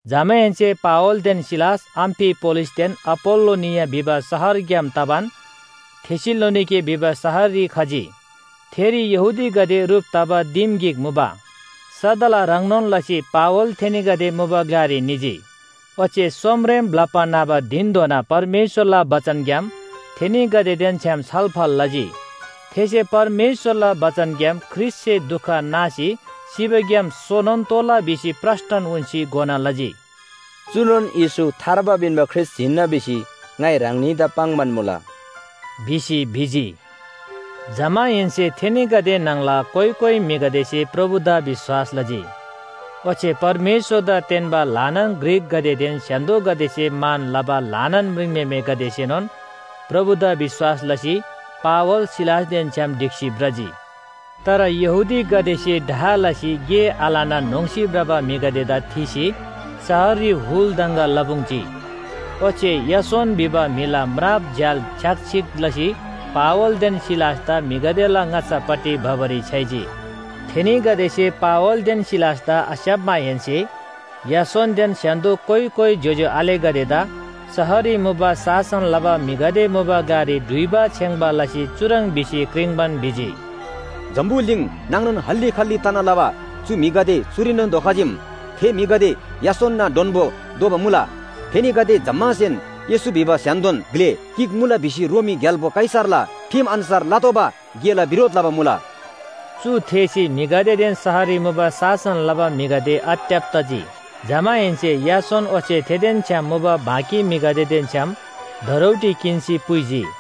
जमाहेन्‍से पावलदेन सिलास अम्‍फिपोलिसदेन अ‍पोल्‍लोनिया भिबा शहरग्‍याम तबान थेसलोनिके भिबा शहररी खजी। थेरी यहूदीगदे ह्रुप तबा दिम गिक मुबा। सदला ह्रङ्नोन लसी पावल थेनीगदे मुबा ग्‍लारी निजी, ओच्‍छे सोमरेम ब्‍लप्‍बा न्‍हबा धिनधोना परमेश्‍वरला बचनग्‍याम थेनीगदेदेन छ्‌याम छलफल लजी। थेसे परमेश्‍वरला बचनग्‍याम ख्रीष्‍टसे दुख नासी सिबाग्‍याम सोनोन तोःला भिसी प्रस्‍टन उन्‍सी घोना लजी। “चुनोन येशू थार्बा पिन्‍बा ख्रीष्‍ट हिन्‍ना भिसी ङाइ ह्राङनीदा पाङ्‌बान मुला,” भिसी भिजी। जमाहेन्‍से थेनीगदे न्‍हङला कोइ कोइ म्‍हिगदेसे प्रभुदा विश्‍वास लजी। ओच्‍छे परमेश्‍वरदा तेन्‍बा ल्‍हानान ग्रीकगदेदेन स्‍य्‍हान्‍दोसे मान लबा ल्‍हानान म्रिङम्‍हेमेगदेसेनोन प्रभुदा विश्‍वास लसी पावल, सिलासदेन छ्‌याम ढिक्‍सी भ्रजी। तर यहूदीगदेसे डाह लसी गे आलना न्‍होङ्‌सी भ्रबा म्‍हिगदेदा थीसी शहररी हुल दङगा लपुङ्‌जी, ओच्‍छे यासोन भिबा म्‍हिला म्राप झ्‍याल छ्‌याकछिक लसी पावलदेन सिलासदा म्‍हिगदेला ङाच्‍छापट्टि भबारी छ्‌याइजी। थेनीगदेसे पावलदेन सिलासदा आस्‍याप्‍माहेन्‍से यासोनदेन स्‍य्‍हान्‍दो कोइ कोइ ज्‍योज्‍यो आलेगदेदा शहररी मुबा शासन लबा म्‍हिगदे मुबा ग्‍लारी डुइबा छेङ्‌बा लसी चुह्रङ् भिसी क्रिङ्‌बान भिजी, “जम्‍बुलिङ नाङनोन हल्‍ली खल्‍ली तना लबा चु म्‍हिगदे चुरीनोन धोखजीम। थे म्‍हिगदे यासोनना डोन्‍बो दोबा मुला, थेनीगदे जम्‍मासेन येशू भिबा स्‍य्‍हान्‍दोन ग्‍ले गिक मुला भिसी रोमी ग्‍याल्‍बो कैसरला ठिम अन्‍छार लतोःबा गेला बिरोध लबा मुला।” चु थेःसी म्‍हिगदेदेन शहररी मुबा शासन लबा म्‍हिगदे आत्‍यब तजी। जमाहेन्‍से यासोन ओच्‍छे थेदेन छ्‌याम मुबा बाँकी म्‍हिगदेदेन छ्‌याम धरौटी किन्‍सी पुइजी।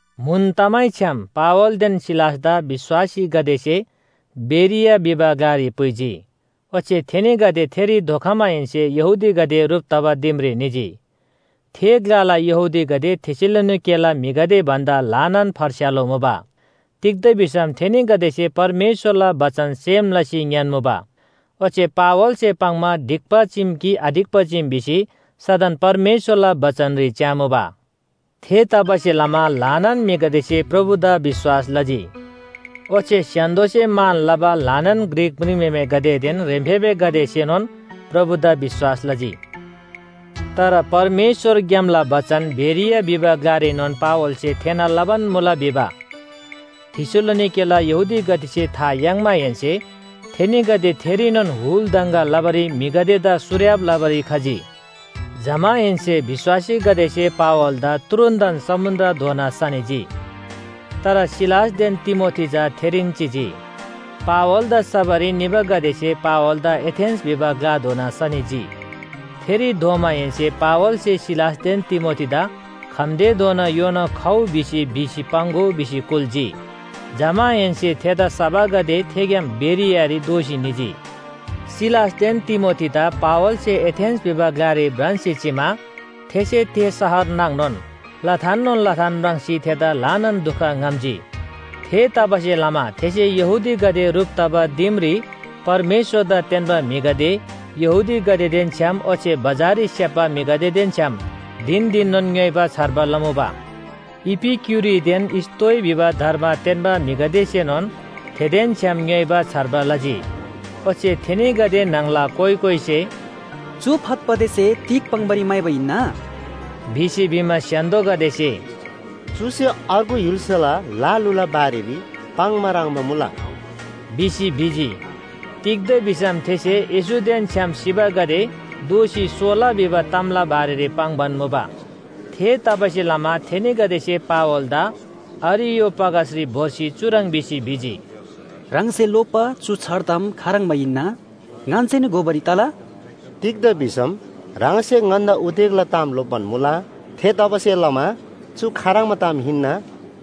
म्‍हुन तमैछ्‌याम पावलदेन सिलासदा विश्‍वासीगदेसे बेरिया भिबा ग्‍लारी पुइजी, ओच्‍छे थेनीगदे थेरी धोखमाहेन्‍से यहूदीगदे ह्रुप तबा दिमरी निजी। थे ग्‍लाला यहूदीगदे थेसलोनिकेला म्‍हिगदे भन्‍दा ल्‍हानान फर्स्‍यालो मुबा। तिग्‍दा भिसम थेनीगदेसे परमेश्‍वरला बचन सेम लसी ङ्‌यान्‍मुबा, ओच्‍छे पावलसे पाङ्‌मा ढिक्‍बा चीम कि आढिक्‍बा चीम भिसी सदन परमेश्‍वरला बचनरी च्‍यामुबा। थेतबासेलमा ल्‍हानान म्‍हिगदेसे प्रभुदा विश्‍वास लजी। ओच्‍छे स्‍य्‍हान्‍दोसे मान लबा ल्‍हानान ग्रीक म्रिङम्‍हेमेगदेदेन ह्रेम्‍फेबेगदेसेनोन प्रभुदा विश्‍वास लजी। तर परमेश्‍वरग्‍यामला बचन बेरिया भिबा ग्‍लारीनोन पावलसे थेःना लबान मुला भिबा थेसलोनिकेला यहूदीगदेसे था याङ्माहेन्‍से थेनीगदे थेरीनोन हुल दङगा लबारी म्‍हिगदेदा सुर्‍याब लबारी खजी। जमाहेन्‍से विश्‍वासीगदेसे पावलदा तुरुन्‍तन समुन्‍द्रधोना सनिजी। तर सिलासदेन तिमोथी चा थेरीन चिजी। पावलदा सबारी निबागदेसे पावलदा एथेन्‍स भिबा ग्‍लाधोना सनिजी। थेरी धोमाहेन्‍से पावलसे सिलासदेन तिमोथीदा खम्‍तेधोना योना खउ भिउ भिसी पाङ्‍गो भिसी कुल्‍जी। जमाहेन्‍से थेदा सबागदे थेग्‍याम बेरियारी दोःसी निजी। सिलासदेन तिमोथीदा पावलसे एथेन्‍स भिबा ग्‍लारी भ्रान्‍सी चिमा थेसे थे शहर नाङनोन लथाननोन लथान म्राङ्सी थेदा ल्‍हानान दुख ङ्‌हम्‍जी। थेतबासेलमा थेसे यहूदीगदे ह्रुप तबा दिमरी परमेश्‍वरदा तेन्‍बा म्‍हिगदे, यहूदीगदेदेन छ्‌याम ओच्‍छे बजाररी स्‍याप्‍बा म्‍हिगदेदेन छ्‌याम धिन धिननोन ङ्‌योइबा छार्बा लमुबा। इपिक्‍युरीदेन स्‍तोइ भिबा धर्म तेन्‍बा म्‍हिगदेसेनोन थेदेन छ्‌याम ङ्‌योइबा छार्बा लजी। ओच्‍छे थेनीगदे न्‍हङला कोइ कोइसे “चु फतफतेसे तिग पाङ्‌बारी म्‍हाइबा हिन्‍ना?” भिसी भिमा, स्‍य्‍हान्‍दोगदेसे “चुसे अर्गु य्‍हुल्‍साला ल लुला बारेरी पाङ्बा ह्रङ्‌बा मुला” भिसी भिजी। तिग्‍दा भिसम थेसे येशूदेन छ्‌याम सिबागदे दोःसी सोला भिबा तामला बारेरी पाङ्‌बान मुबा। थेतबासेलमा थेनीगदेसे पावलदा अरियोपागसरी भोर्सी चुह्रङ् भिसी भिजी, “ह्राङसे लोप्‍बा चु छार ताम खाह्रङ्बा हिन्‍ना, ङन्‍सेनोन घोबारी तला? तिग्‍दा भिसम ह्राङसे ङन्‍दा उदेकला ताम लोप्‍बान मुला। थेतबासेलमा चु खाह्रङ्बा ताम हिन्‍ना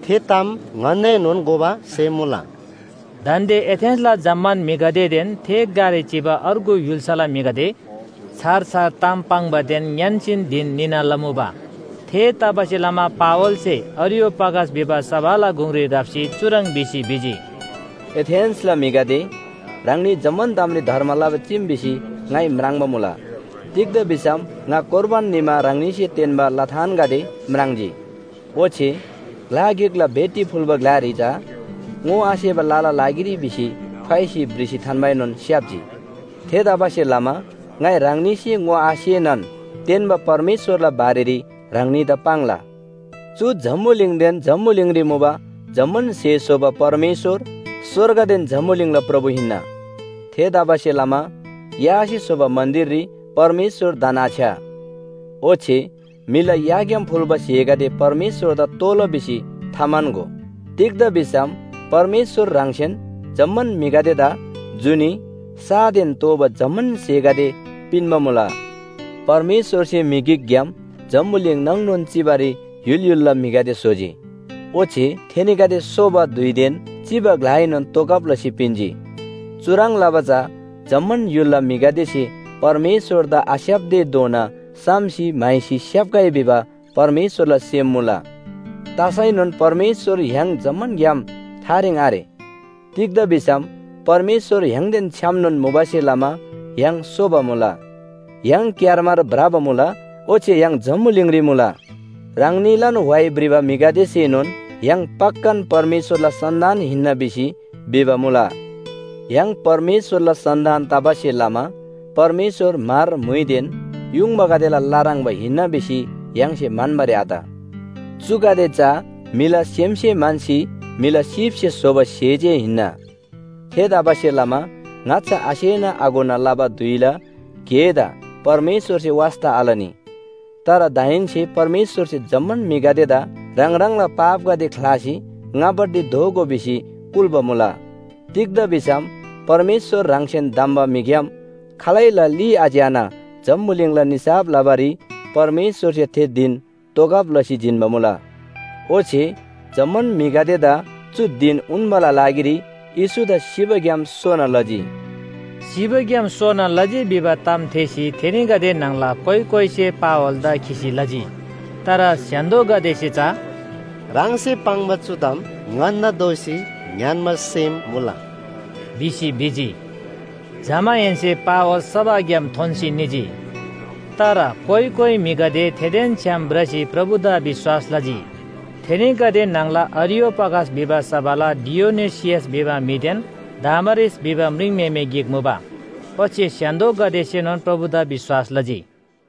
थे ताम ङन्‍दाएनोन घोबा सेम मुला।” दान्‍दे एथेन्‍सला जम्‍मान म्‍हिगदेदेन थे ग्‍लारी चिबा अर्गु य्‍हुल्‍साला म्‍हिगदे छार छार ताम पाङ्‌बादेन ङ्‌यान्‍सीन धिन निना लमुबा। थेतबासेलमा पावलसे अरियोपागस भिबा सभाला गुङरी राप्‍सी चुह्रङ् भिसी भिजी, “एथेन्‍सला म्‍हिगदे, ह्राङनी जम्‍मान तामरी धर्म लबा चीम भिसी ङाइ म्राङ्बा मुला। तिग्‍दा भिसम ङा कोर्बान निमा ह्राङनीसे तेन्‍बा लथानगदे म्राङ्जी। ओच्‍छे ग्‍ला गिकला भेटी फुल्‍बा ग्‍लारी चा ‘ङोआसेबा लला लागिरी’ भिसी ठ्वाइसी भ्रिसी थान्‍बाएनोन स्‍याप्‍जी। थेतबासेलमा ङाइ ह्राङनीसे ङोआसेनान तेन्‍बा परमेश्‍वरला बारेरी ह्राङनीदा पाङ्ला। “चु जम्‍बुलिङदेन जम्‍बुलिङरी मुबा जम्‍मान स्‍हे स्‍होबा परमेश्‍वर स्‍वर्गदेन जम्‍बुलिङला प्रभु हिन्‍ना, थेतबासेलमा यासे स्‍होबा मन्‍दिररी परमेश्‍वर धन्‍आछ्‌या। ओच्‍छे म्‍हिला याग्‍याम फुल्‍बा स्‍हेगदे परमेश्‍वरदा तोःला भिसी थाम्‍हन्‍गो। तिग्‍दा भिसम परमेश्‍वर ह्राङसेन जम्‍मान म्‍हिगदेदा जुनी, सादेन तोःबा जम्‍मान स्‍हेगदे पिन्‍बा मुला। परमेश्‍वरसे म्‍हि गिकग्‍याम जम्‍बुलिङ नाङनोन चिबारी य्‍हुल य्‍हुलला म्‍हिगदे स्‍होजी। ओच्‍छे थेनीगदे सोबा धुइदेन चिबा ग्‍लाएनोन तोगब लसी पिन्‍जी। चुह्रङ् लबा चा जम्‍मान य्‍हुलला म्‍हिगदेसे परमेश्‍वरदा आस्‍याप्‍तेधोना साम्‍सी म्‍हाइसी स्‍याप्‍गै भिबा परमेश्‍वरला सेम मुला। तसैनोन परमेश्‍वर य्‍हाङ जम्‍मानग्‍याम थारेङ आरे। तिग्‍दा भिसम परमेश्‍वर य्‍हाङदेन छ्‌यामनोन मुबासे लमा य्‍हाङ सोबा मुला, य्‍हाङ क्‍यारमार भ्रबा मुला ओच्‍छे य्‍हाङ जम्‍बुलिङरी मुला। ह्राङनीलान व्‍हाइ भ्रिबा म्‍हिगदेसेनोन ‘य्‍हाङ पक्‍कान परमेश्‍वरला सन्‍तान हिन्‍ना’ भिसी भिबा मुला। य्‍हाङ परमेश्‍वरला सन्‍तान तबासे लमा परमेश्‍वर म्‍हर, म्‍हुइदेन युङबागदेला ल ह्रङ्‌बा हिन्‍ना भिसी य्‍हाङसे म्‍हन्‍बारी आत। चुगदे चा म्‍हिला सेमसे म्‍हन्‍सी म्‍हिला सीपसे स्‍होबा स्‍हे जे हिन्‍ना। थेतबासेलमा ङाच्‍छा आसेना आघोना लबा धुइला गेदा परमेश्‍वरसे वास्‍ता आलनी। तर दाहेन्‍से परमेश्‍वरसे जम्‍मान म्‍हिगदेदा “ह्राङ ह्राङला पापगदे ख्‍लासी ङापट्टि दोःगो” भिसी कुल्‍बा मुला। तिग्‍दा भिसम परमेश्‍वर ह्राङसेन धम्‍बा म्‍हिग्‍याम खालैला ली आच्‍याना जम्‍बुलिङला निसाफ लबारी परमेश्‍वरसे थे धिन तोगब लसी जिन्‍बा मुला। ओच्‍छे जम्‍मान म्‍हिगदेदा चु धिन उन्‍बाला लागिरी येशूदा सिबाग्‍याम सोना लजी।” सिबाग्‍याम सोना लजी भिबा ताम थेःसी थेनीगदे न्‍हङला कोइ कोइसे पावलदा खिसी लजी। तर स्‍य्‍हान्‍दोगदेसे चा “ह्राङसे पाङ्बा चु ताम ङन्‍दा दोःसी ङ्‌यान्‍बा सेम मुला” भिसी भिजी। जमाहेन्‍से पावल सभाग्‍याम थोन्‍सी निजी। तर कोइ कोइ म्‍हिगदे थेदेन छ्‌याम भ्रसी प्रभुदा विश्‍वास लजी। थेनीगदे न्‍हङला अरियोपागस भिबा सभाला डियनुसियस भिबा म्‍हिदेन दामारिस भिबा म्रिङम्‍हेमे गिक मुबा ओच्‍छे स्‍य्‍हान्‍दोगदेसेनोन प्रभुदा विश्‍वास लजी।